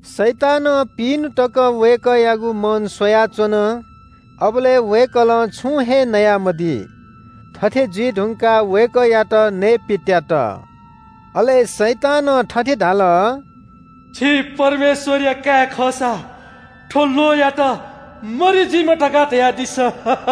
शैतानं पिइन्‍हु तक वय्‌कःयागु मन स्‍वयाच्‍वन। अबलय् वय्‌कलं छुं हे नयामदी। थथे जुइ धुंकाः वय्‌कःयात नयेपित्‍यात। अले शैतानं थथे धाल – “छि परमेश्‍वरया काय् खःसा थ्‍व ल्‍वहंयात मरि जुइमा धकाः धयादिसँ।”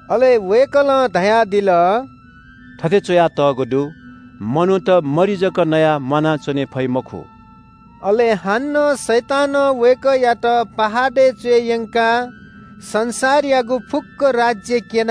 अले वय्‌कलं धयादिल – “थथे च्‍वयातःगु दु – ‘मनूत मरि जक नयाः म्‍वानाच्‍वने फइ मखु।’” अले हानं शैतानं वय्‌कःयात पहाडय् च्‍वय् यंकाः संसारयागु फुक्‍क राज्‍य क्‍यन,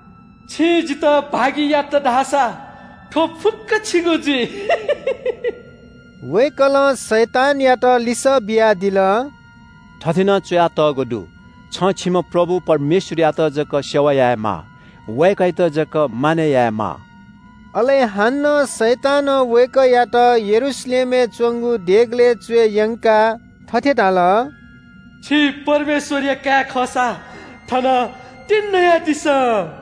छिं जितः भागि यात धाःसा थ्‍व फुक्‍कं छिगु जुइ।” वय्‌कलं शैतानयात लिसः बियादिल – “थथे नं च्‍वयातःगु दु – “‘छं छिम्‍ह प्रभु परमेश्‍वरयात जक सेवा यायेमाः। वय्‌कःयात जक मानय् यायेमाः।’” अले हानं शैतानं वय्‌कःयात यरूशलेमय् च्‍वंगु देगलय् च्‍वय् यंकाः थथे धाल – “छि परमेश्‍वरया काय् खःसा थनं तिंन्‍हुयादिसँ,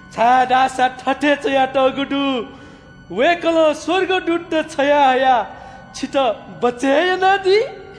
छाय्‌धाःसा थथे च्‍वयातःगु दु – “‘वय्‌कलं स्‍वर्गदूतत छ्वयाहयाः छितः बचय् यानादी।’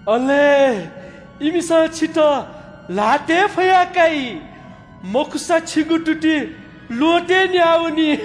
अले ‘इमिसं छितः ल्‍हातय् फया काइ। मखुसा छिगु तुति ल्‍वहँतय् न्‍याः वनी।’”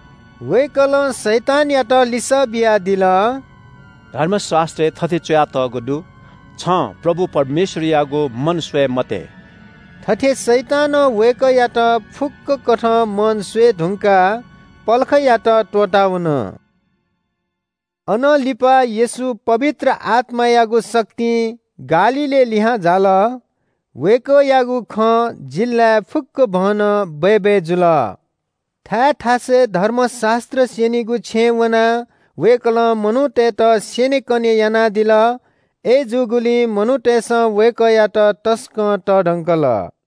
वय्‌कलं शैतानयात लिसः बियादिल – “धर्मशास्‍त्रय् थथे च्‍वयातःगु दु – ‘छं परमप्रभु परमेश्‍वरयागु मन स्‍वये मते।’” थथे शैतानं वय्‌कःयात फुक्‍क कथं मन स्‍वये धुंकाः पलखयात त्‍वःतावन। अनं लिपा येशू पवित्र आत्‍मायागु शक्तिं गालीलय् लिहां झाल। वय्‌कःयागु खँ जिल्‍लाय् फुक्‍कभनं बय्‌बय् जुल। थाय् थासय् धर्मशास्‍त्र स्‍यनीगु छेँय् वनाः वय्‌कलं मनूतय्‌त स्‍यनेकने यानादिल। अय्‌जूगुलिं मनूतय्‌सं वय्‌कःयात तसकं तःधकंल।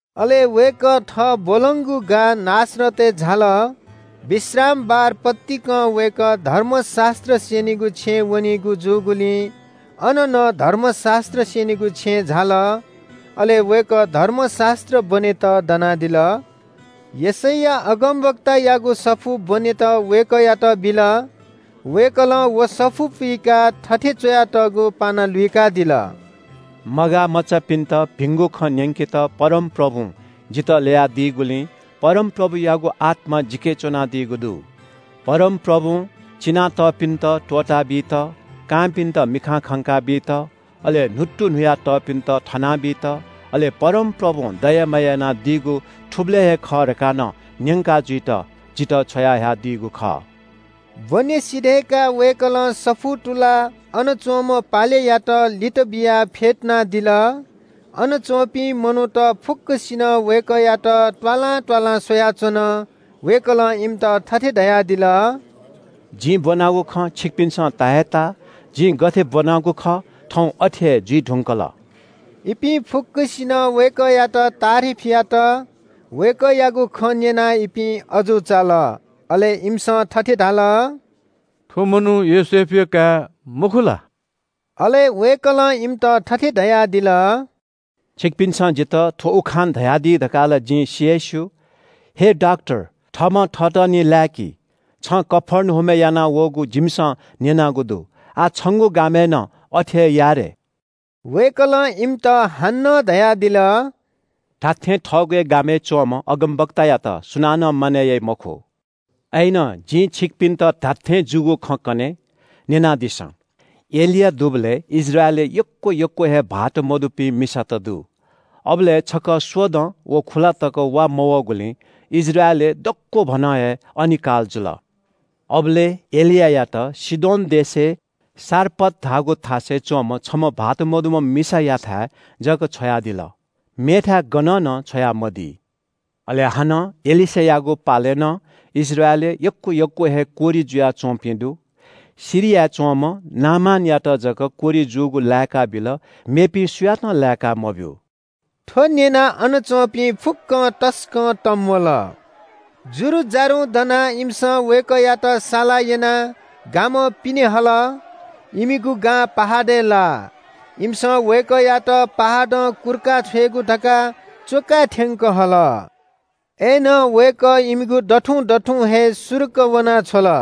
अले वय्‌कः थः ब्‍वलंगु गां नासरतय् झाल। विश्रामबार पतिकं वय्‌कः धर्मशास्‍त्र स्‍यनीगु छेँय् वनीगु जूगुलिं अन नं धर्मशास्‍त्र स्‍यनीगु छेँय् झाल। अले वय्‌कः धर्मशास्‍त्र ब्‍वनेत दनादिल। यशैया अगमवक्तायागु सफू ब्‍वनेत वय्‌कःयात बिल। वय्‌कलं व सफू पुइकाः थथे च्‍वयातःगु पाना लुइकादिल – “मगाःमचाःपिन्‍त भिंगु खँ न्‍यंकेत परमप्रभुं जितः ल्‍ययादीगुलिं परमप्रभुयागु आत्‍मा जिके च्‍वनादीगु दु। परमप्रभुं चिना तःपिन्‍त त्‍वःताबीत, कांपिन्‍त मिखां खंका बीत, अले न्‍हुत्तुन्‍हुया तःपिन्‍त थना बीत, अले परमप्रभुं दया माया यानादीगु थुबलय् हे खः धकाः नं न्‍यंका जुइत जितः छ्वयाहयादीगु खः।” ब्‍वने सिधय्‌काः वय्‌कलं सफू तुलाः अन च्‍वंम्‍ह पालेयात लित बियाः फ्‍यतुनादिल। अन च्‍वंपिं मनूत फुक्‍कसिनं वय्‌कःयात त्‍वालां त्‍वालां स्‍वयाच्‍वन। वय्‌कलं इमित थथे धयादिल – “जिं ब्‍वनागु खँ छिकपिन्‍सं ता हे ताः। जिं गथे ब्‍वनागु खः, थौं अथे हे जुइ धुंकल।” इपिं फुक्‍कसिनं वय्‌कःयात तारिफ यात। वय्‌कःयागु खँ न्‍यनाः इपिं अजू चाल। अले इमिसं थथे धाल – “थ्‍व मनू योसेफया काय् मखु ला?” अले वय्‌कलं इमित थथे धयादिल – “छिकपिन्‍सं जितः थ्‍व उखान धयादी धकाः ला जिं सि हे स्‍यू – ‘हे डाक्‍टर, थःम्‍हं थःतः निं लाय्‌कि। छं कफर्नहुमय् यानावःगु जिमिसं न्‍यनागु दु, आः छंगु गामय् नं अथे हे या रे।’ वय्‌कलं इमित हानं धयादिल – धात्‍थें, थःगु हे गामय् च्‍वंम्‍ह अगमवक्तायात सुनानं मानय् याइ मखु। “अय्‌नं जिं छिकपिन्‍त धात्‍थें जूगु खँ कने, न्‍यनादिसँ – एलिया दुबलय् इस्राएलय् यक्‍व यक्‍व हे भाःत मदुपिं मिसात दु। अबलय् छकः स्‍वदँ व खुलातक वा मवःगुलिं इस्राएलय् दक्‍वभनं हे अनिकाल जुल। अबलय् एलियायात सीदोन देशय् सारपत धाःगु थासय् च्‍वंम्‍ह छम्‍ह विधवा मिसायाथाय् जक छ्वयादिल, मेथाय् गनं नं छ्वयामदी। अले हानं एलीशा अगमवक्तायागु पालय् नं इस्राएलय् यक्‍व यक्‍व हे कोह्रि जुयाच्‍वंपिं दु। सिरियाय् च्‍वंम्‍ह नामानयात जक कोह्रि जूगु लाय्‌काबिल, मेपिं सुयातं लाय्‌का मब्‍यू।” थ्‍व न्‍यनाः अन च्‍वंपिं फुक्‍कं तसकं तंम्‍वल। जुरुजारुं दनाः इमिसं वय्‌कःयात साला यनाः गामं पिने हल। इमिगु गां पहाडय् लाः। इमिसं वय्‌कःयात पहाडं कुर्का छ्वयेगु धकाः च्‍वकाय् थ्‍यंक हल। अय्‌नं वय्‌कः इमिगु दथुं दथुं हे सुरुक्‍क वना छ्वल।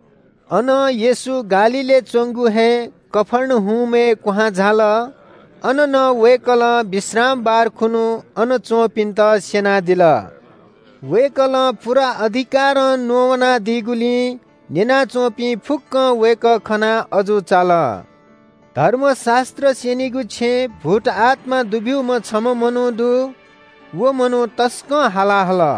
अनं येशू गालीलय् च्‍वंगु हे कफर्नहुमय् क्‍वहां झाल। अन नं वय्‌कलं विश्रामबार खुन्‍हु अन च्‍वंपिन्‍त स्‍यनादिल। वय्‌कलं पूरा अधिकारं न्‍ववानादीगुलिं न्‍यना च्‍वंपिं फुक्‍कं वय्‌कः खनाः अजू चाल। धर्मशास्‍त्र स्‍यनीगु छेँय् भूतआत्‍मा दुब्‍यूम्‍ह छम्‍ह मनू दु। व मनू तसकं हाला हल –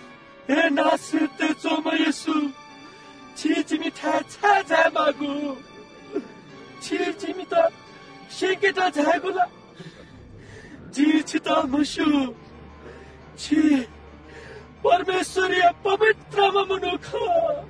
“हे नासरतय् च्‍वंम्‍ह येशू, छि जिमिथाय् छाय् झायेमाःगु? छि जिमित स्‍यंकेत झायागु ला? जिं छितः म्‍हस्‍यू, छि परमेश्‍वरया पवित्रम्‍ह मनू खः।”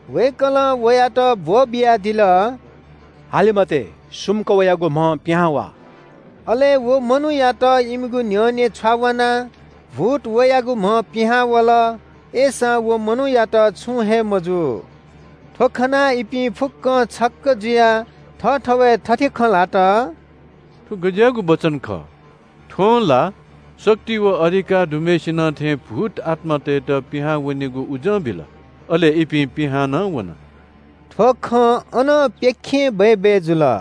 वय्‌कलं वयात ब्‍वःबियादिल – “हाले मते, सुम्‍क वयागु म्‍हं पिहां वा।” अले व मनूयात इमिगु न्‍ह्यःने छ्वावानाः भूत वयागु म्‍हं पिहां वल, अय्‌सां व मनूयात छुं हे मजू। थ्‍व खनाः इपिं फुक्‍कं छक्‍क जुयाः थःथवय् थथे खँ ल्‍हात – “थ्‍व गज्‍याःगु वचन खः? थ्‍वं ला शक्ति व अधिकार दुम्‍हय्‌सिनं थें भूतआत्‍मातय्‌त पिहां वनेगु उजं बिल, अले इपिं पिहां नं वन।” थ्‍व खँ अनं प्‍यखें बय्‌बय् जुल।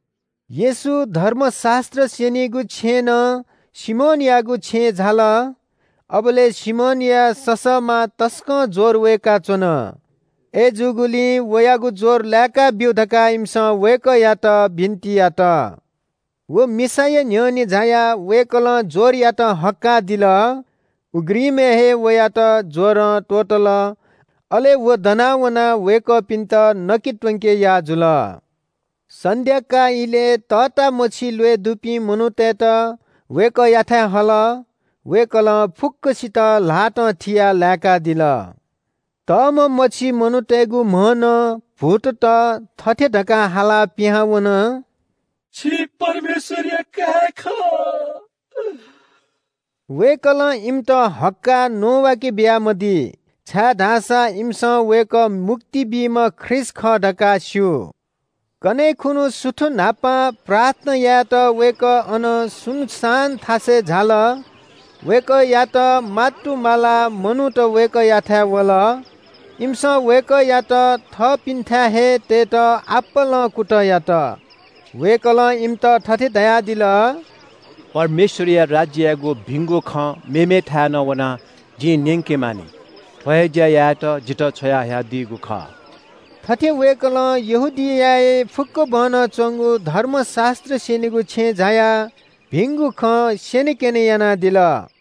येशू धर्मशास्‍त्र स्‍यनीगु छेँनं सिमोनयागु छेँय् झाल। अबलय् सिमोनया ससःमां तसकं ज्‍वर वय्‌काच्‍वन। अय्‌जूगुलिं वयागु ज्‍वर लाय्‌काब्‍यु धकाः इमिसं वय्‌कःयात बिन्‍ति यात। व मिसाया न्‍ह्यःने झायाः वय्‌कलं ज्‍वरयात हक्‍काः दिल। उघ्रिमय् वयात ज्‍वरं त्‍वःतल। अले व दना वनाः वय्‌कःपिन्‍त नके त्‍वंके याः जुल। सन्‍ध्‍याकाः इलय् तःतामछि ल्‍वय् दुपिं मनूतय्‌त वय्‌कःयाथाय् हल। वय्‌कलं फुक्‍कसित ल्‍हातं थियाः लाय्‌कादिल। तःम्‍ह मछि मनूतय्‌गु म्‍हं नं भूतत थथे धकाः हालाः पिहां वन – “छि परमेश्‍वरया काय् खः।” वय्‌कलं इमित हक्‍काः न्‍ववाके बियामदी, छाय्‌धाःसा इमिसं वय्‌कः मुक्ति बीम्‍ह ख्रीष्‍ट खः धकाः स्‍यू। कन्‍हय् खुन्‍हु सुथ न्‍हापां प्रार्थना यायेत वय्‌कः अनं सुनसान थासय् झाल। वय्‌कःयात मातुमालाः मनूत वय्‌कःयाथाय् वल। इमिसं वय्‌कःयात थःपिन्‍थाय् हे तयेत आपालं कुतः यात। वय्‌कलं इमित थथे धयादिल – “परमेश्‍वरया राज्‍ययागु भिंगु खँ मेमेथाय् नं वनाः जिं न्‍यंके मानि। थ्‍व हे ज्‍या यायेत जितः छ्वयाहयादीगु खः।” थथे वय्‌कलं यहूदियाय् फुक्‍कभनं च्‍वंगु धर्मशास्‍त्र स्‍यनीगु छेँय् झायाः भिंगु खँ स्‍यनेकने यानादिल।